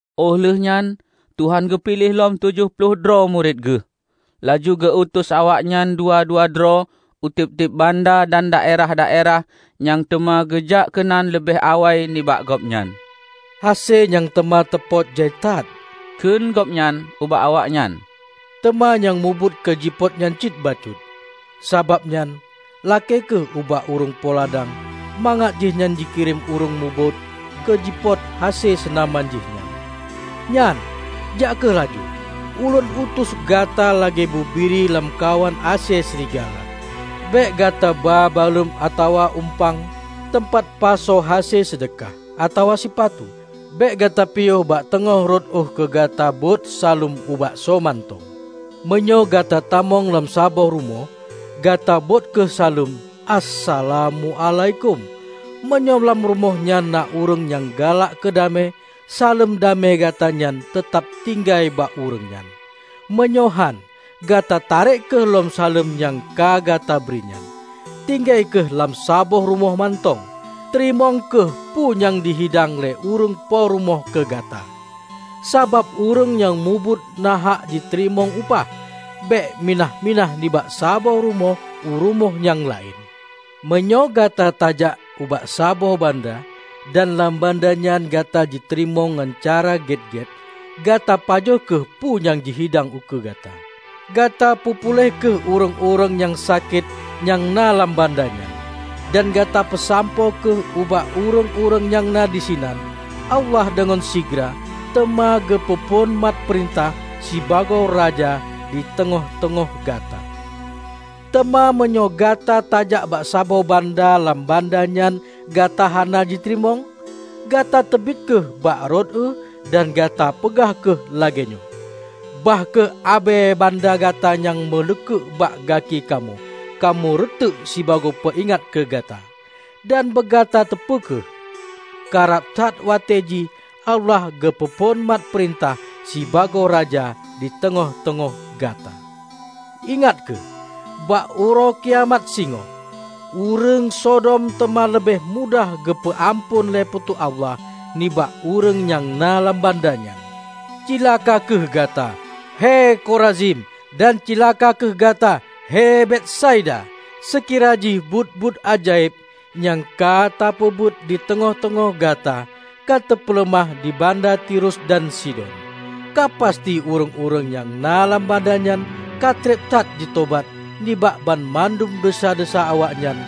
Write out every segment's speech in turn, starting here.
Óh lheuehnyan Tuhan geupiléh lom tujoh ploh droe murit geuh, laju geu-utus awaknyan dua-dua droe u tieb-tieb banda dan daerah-daerah nyang teuma geujak keunan leubeh awai nibak Gobnyan. "Hase nyang teuma teupôt jai that," kheun gobnyan ubak awaknyan, "teuma nyang mubuet keu jipôt nyan cit bacut. Sabab nyan, lakée kheueh ubak ureuëng po ladang mangat jihnyan jikirém ureuëng mubuet keu jipôt hase seunaman jih nyan. Nyan, jak kheueh laju! Ulôn utus gata lagée bubiri lam kawan asée srigala. Bék gata ba baluem atawa uempang teumpat pasoe hase seudeukah, atawa sipatu. Bék gata piôh bak teungoh rot ueh keu gata bôt saleuem ubak soe mantong. Meunyoe gata tamong lam saboh rumoh, gata bôt kheueh saleuem, 'Assalamuálaikum.' Meunyoe lam rumoh nyan na ureuëng nyang galak keu damé, saleuem damé gata nyan teutab tinggai bak ureuëng nyan; meunyoe hán, gata tarek kheueh lom saleuem nyang ka gata bri nyan. Tinggai kheueh lam saboh rumoh mantong. Teurimong kheueh peue nyang jihidang lé ureuëng po rumoh keu gata, sabab ureuëng nyang mubuet nahak jiteurimong upah. Bék minah-minah nibak saboh rumoh u rumoh nyang laén. Meunyoe gata tajak ubak saboh banda dan lam banda nyan gata jiteurimong ngon cara gét-gét, gata pajoh kheueh peue nyang jihidang ukeue gata. Gata peupuléh kheueh ureuëng-ureuëng nyang sakét nyang na lam banda nyan, dan gata peusampoe kheueh ubak ureuëng-ureuëng nyang na disinan, 'Allah deungon sigra teuma geupeu phon mat peurintah sibagoe Raja di teungoh-teungoh gata.' Teuma meunyoe gata tajak bak saboh banda lam banda nyan gata hana jiteurimong, gata teubiet kheueh bak rot ueh dan gata peugah kheueh lagée nyoe, 'Bah kheueh abée banda gata nyang meuleukek bak gaki kamoe, kamoe reuteuk sibagoe peuingat keu gata. Dan beugata teupeu kheueh, karab that watée jih Allah geupeu phon mat peurintah sibagoe Raja di teungoh-teungoh gata!' Ingat kheueh, bak uroe kiamat singoh, ureuëng Sodom teuma leubeh mudah geupeu amphon lé Po teu Allah nibak ureuëng nyang na lam banda nyan!" "Cilaka kheueh gata, hei Korazim! Dan Cilaka kheueh gata, hei Betsaida! Seukira jih buet-buet ajaéb nyang ka teupeubuet di teungoh-teungoh gata ka teupeuleumah di banda Tirus dan Sidon, ka pasti ureuëng-ureuëng nyang na lam banda nyan ka treb that jitobat nibak banmandum desya-desya awaknyan,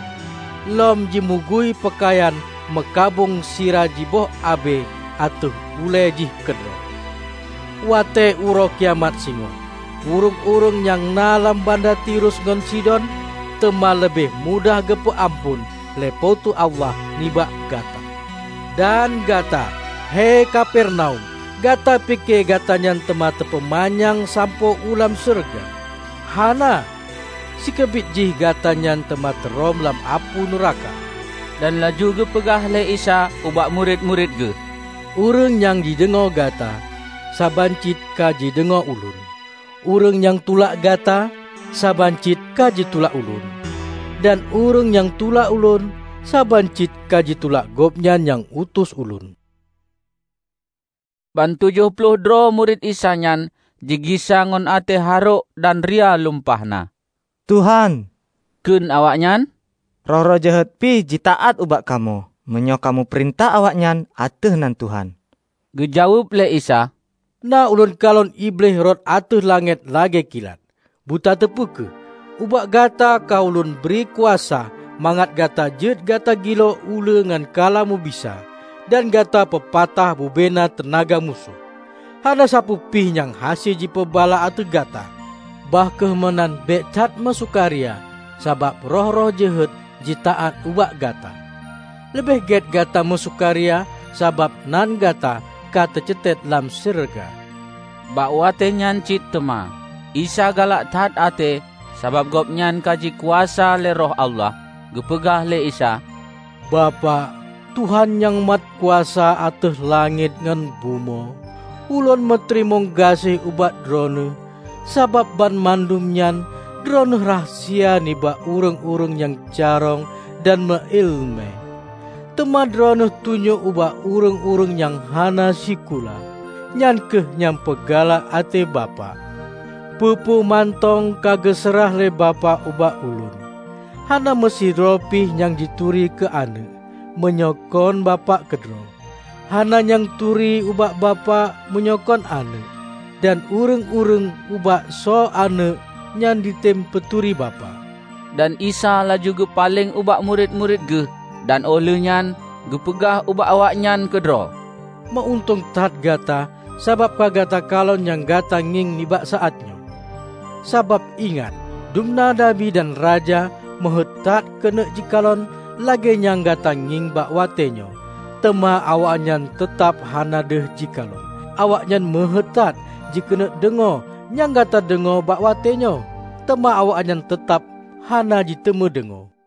lom jimugui peukayan meukabông sira jiboh abée ateueh ulée jih keudroe. Watée uroe kiamat singoh, ureuëng-ureuëng nyang na lam banda Tirus ngon Sidon teuma leubeh mudah geupeu amphon lé Po teu Allah nibak gata. Dana gata, hei Kapernaum! Gata pike, gata nyan teuma teupeumanyang sampoe u lam syeuruga? Hana! Sikeubit jih gata nyan teuma teurhom lam apui nuraka!" Dan laju geupeugah lé Isa ubak murit-murit Geuh, "Ureuëng nyang jideungoe gata, saban cit ka jideungoe Ulôn. Ureuëng nyang tulak gata, saban cit ka jitulak Ulôn. Dan ureuëng nyang tulak Ulôn, saban cit ka jitulak Gobnyan nyang utus Ulôn." Ban tujoh ploh droe murit Isa nyan jigisa ngon até harôk dan ria lumpah na. "Tuhan," kheun awaknyan, "roh-roh jeuhet pih jitaát ubak kamoe meunyoe kamoe peurintah awaknyan ateueh nan Tuhan!" Geujaweueb lé Isa, "Na Ulôn kalon Iblih rhot ateueh langét lagée kilat. Butateupeu kheueh! Ubak gata ka ulôn bri kuasa mangat gata jeuet gata giloe uleue ngon kala mubisa dan gata peupatah bubena teunaga musoh, hana sapeue pih nyang hase jipeubala ateueh gata. Bah kheueh meunan bék that meusukaria sabab roh-roh jeuhet jitaát ubak gata. Leubeh gét gata meusukaria sabab nan gata ka teucetet lam syeuruga." Bak watée nyan cit teuma, Isa galak that até sabab Gobnyan ka jikuasa lé Roh Allah. Geupeugah lé Isa, "Bapak, Tuhan nyang mat kuasa ateueh langét ngon bumoe! Ulôn meuteurimong gaséh ubak Droeneueh sabab banmandum nyan Droeneueh rahsia nibak ureuëng-ureuëng nyang carông dan meu iéleumé, teuma Droeneueh tunyok ubak ureuëng-ureuëng nyang hana sikula. Nyan kheueh nyang peugalak até Bapak. Peue-peue mantong ka geuseurah lé Bapak ubak Ulôn. Hana meusidroe pih nyang jituri keu Aneuëk, meunyoe kon Bapak keudroe. Hana nyang turi ubak Bapak meunyoe kon Aneuëk; dan ureuëng-ureuëng ubak soe Aneuëk nyan jitem peuturi Bapak." Dan Isa laju geupaleng ubak murit-murit Geuh, dan óh lheueh nyan geupeugah ubak awaknyan keudroe, "Meu-untông that gata sabab ka gata kalon nyang gata ngieng nibak saát nyoe. Sabab ingat: Dumna Nabi dan raja meuheuét that keuneuk jikalon lagée nyang gata ngieng bak watée nyoe teuma awaknyan teutab hana deuh jikalon. Awaknyan meuheuét that jikeuneuk deungoe nyang gata deungoe bak watée nyoe, teuma awaknyan teutab hana jiteumé deungoe."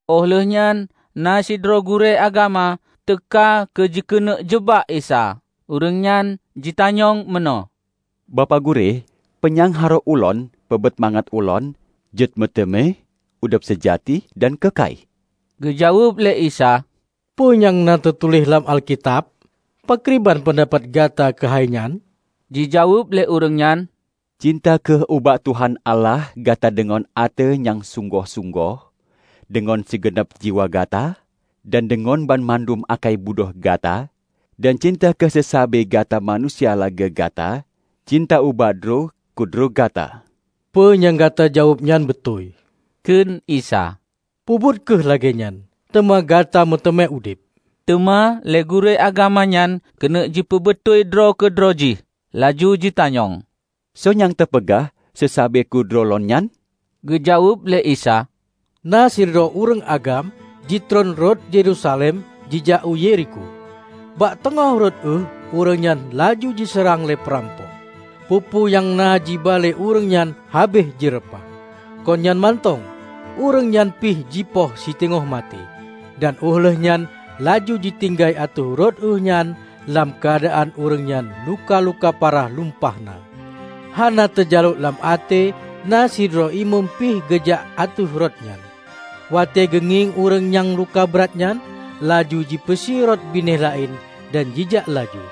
Óh lheuehnyan na sidroe gurée agama teuka keu jikeuneuk jeubak Isa. Ureuëng nyan jitanyong meunoe, "Bapak Gurée, peu nyang harôh ulôn peubuet mangat ulôn jeuet meuteumé udeb seujati dan keukai?" Geujaweueb lé Isa, "Peue nyang na teutuléh lam Alkitab? Pakriban peundapat gata keuhai nyan?" Jijaweueb lé ureuëng nyan, " 'Cinta kheueh ubak Tuhan Allah gata deungon até nyang sunggoh-sunggoh, deungon sigeunab jiwa gata, dan deungon banmandum ákai budho gata,' dan 'Cinta kheueh seusabe gata manusia lagée gata cinta ubak droe keudroe gata.' " "Peue nyang gata jaweueb nyan beutôi," kheun Isa. "Peubuet kheueh lagée nyan, teuma gata meuteumé udeb." Teuma lé gurée agama nyan keuneuk jipeubeutôi droe keudroe jih. Laju jitanyong, "soe nyang teupeugah seusabe keudroe lôn nyan?" Geujaweueb lé Isa, "Na sidroe ureuëng agam jitron rot Yerusalem jijak u Yerikho. Bak teungoh rot ueh ureuëng nyan laju jiseurang lé peurampok, peue-peue nyang na jiba lé ureuëng nyan habéh jireupah, kon nyan mantong ureuëng nyan pih jipoh siteungoh maté, dan óh lheueh nyan laju jitinggai ateueh rot ueh nyan lam keuadaan ureuëng nyan luka-luka parah lumpah na. Hana teujalok lam até na sidroe imeum pih geujak ateueh rot nyan. Watée geungieng ureuëng nyang luka brat nyan, laju jipeusie rot binéh laén, dan jijak laju.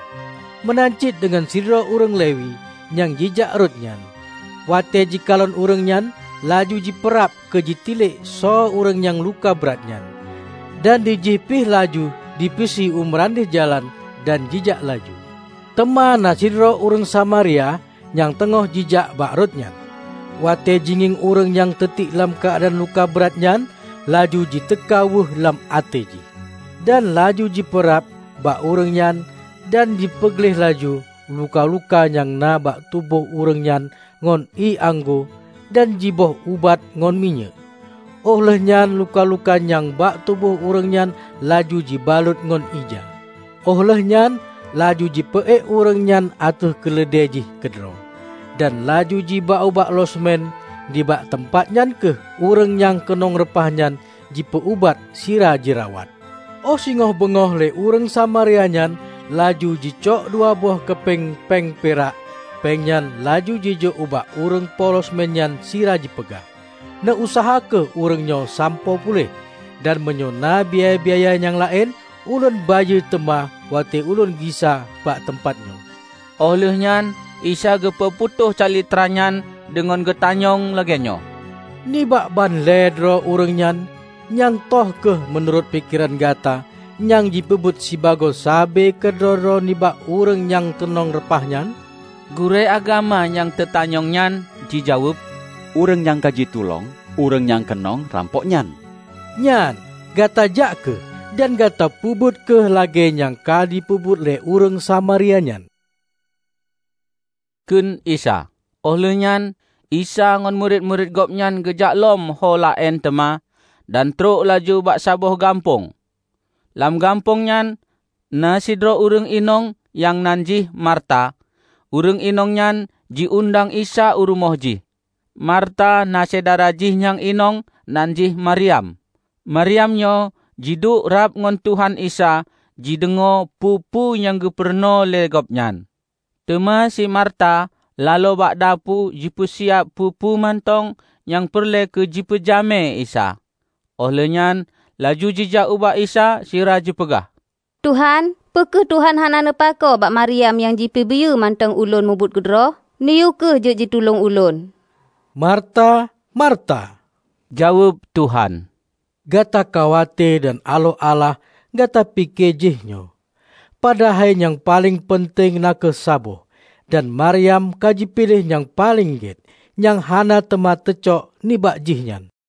Meunan cit deungon sidroe ureuëng Lewi nyang jijak rot nyan; watée jikalon ureuëng nyan, laju jipeurab keu jitilek soe ureuëng nyang luka brat nyan. Dan dijih pih laju jipeusie u meurandeh jalan, dan jijak laju. Teuma na sidroe ureuëng Samaria nyang teungoh jijak bak rot nyan. Watée jingieng ureuëng nyang teutiek lam keuadaan luka brat nyan, laju jiteuka weueh lam até jih. Dan laju jipeurab bak ureuëng nyan dan jipeugleh laju luka-luka nyang na bak tuboh ureuëng nyan ngon ié anggô dan jiboh ubat ngon minyéuk, óh lheueh nyan luka-luka nyang bak tuboh ureuëng nyan laju jibalot ngon ija. Óh lheuehnyan, laju jipeuék ureuëng nyan ateueh keuleudée jih keudroe, dan laju jiba ubak losmen nibak teumpat nyan kheueh ureuëng nyang keunong reupah nyan jipeu-ubat sira jirawat. Óh singoh beungoh lé ureuëng Samaria nyan laju jicok dua boh keupeng péng pirak péng nyan laju jijok ubak ureuëng po losmen nyan sira jipeugah, 'Neu-useuha kheueh ureuëng nyoe sampoe puléh, dan meunyoe na biaya-biaya nyang laén, ulôn bayeue teuma watée ulôn gisa bak teumpat nyoe.' " Óh lheueh nyan Isa geupeu putôh calitra nyan deungon geutanyong lagée nyoe, "Nibak ban lhée droe ureuëng nyan, nyang toh kheueh, meunurot pikeran gata, nyang jipeubuet sibagoe sabe keudroe-droe nibak ureuëng nyang keunong reupah nyan?" Gurée agama nyang teutanyong nyan jijaweueb, "Ureuëng nyang ka jitulông ureuëng nyang keunong rampok nyan." "Nyan, gata jak kheueh, dan gata peubuet kheueh lagée nyang ka jipeubuet lé ureuëng Samaria nyan!" kheun Isa. Óh lheueh nyan Isa ngon murit-murit gobnyan geujak lom ho laén teuma, dan trok laju bak saboh gampông. Lam gampông nyan, na sidroe ureuëng inong nyang nan jih Marta, ureuëng inong nyan jiundang Isa u rumoh jih. Marta na syedara jih nyang inong nan jih Maryam. Maryam nyoe jiduek rab ngon Tuhan Isa jideungoe peue-peue nyang geupeurunoe lé Gobnyan. Teuma si Marta laloe bak dapu jipeusiab peue-peue mantong nyang peureulée keu jipeujamé Isa. Óh lheueh nyan laju jijak ubak Isa sira jipeugah, "Tuhan, peu kheueh Tuhan hana neupakoe bak Maryam nyang jipeubiyeu mantong ulôn meubuet keudroe? Neuyue kheueh jeuet jitulông ulôn!" "Marta, Marta!" jaweueb Tuhan. "Gata khawate dan aloh alah gata pike jéh nyoe; padahai nyang paleng peunteng na kheueh saboh. Dan Maryam ka jipiléh nyang paleng gét, nyang hana teuma teucok nibak jih nyan."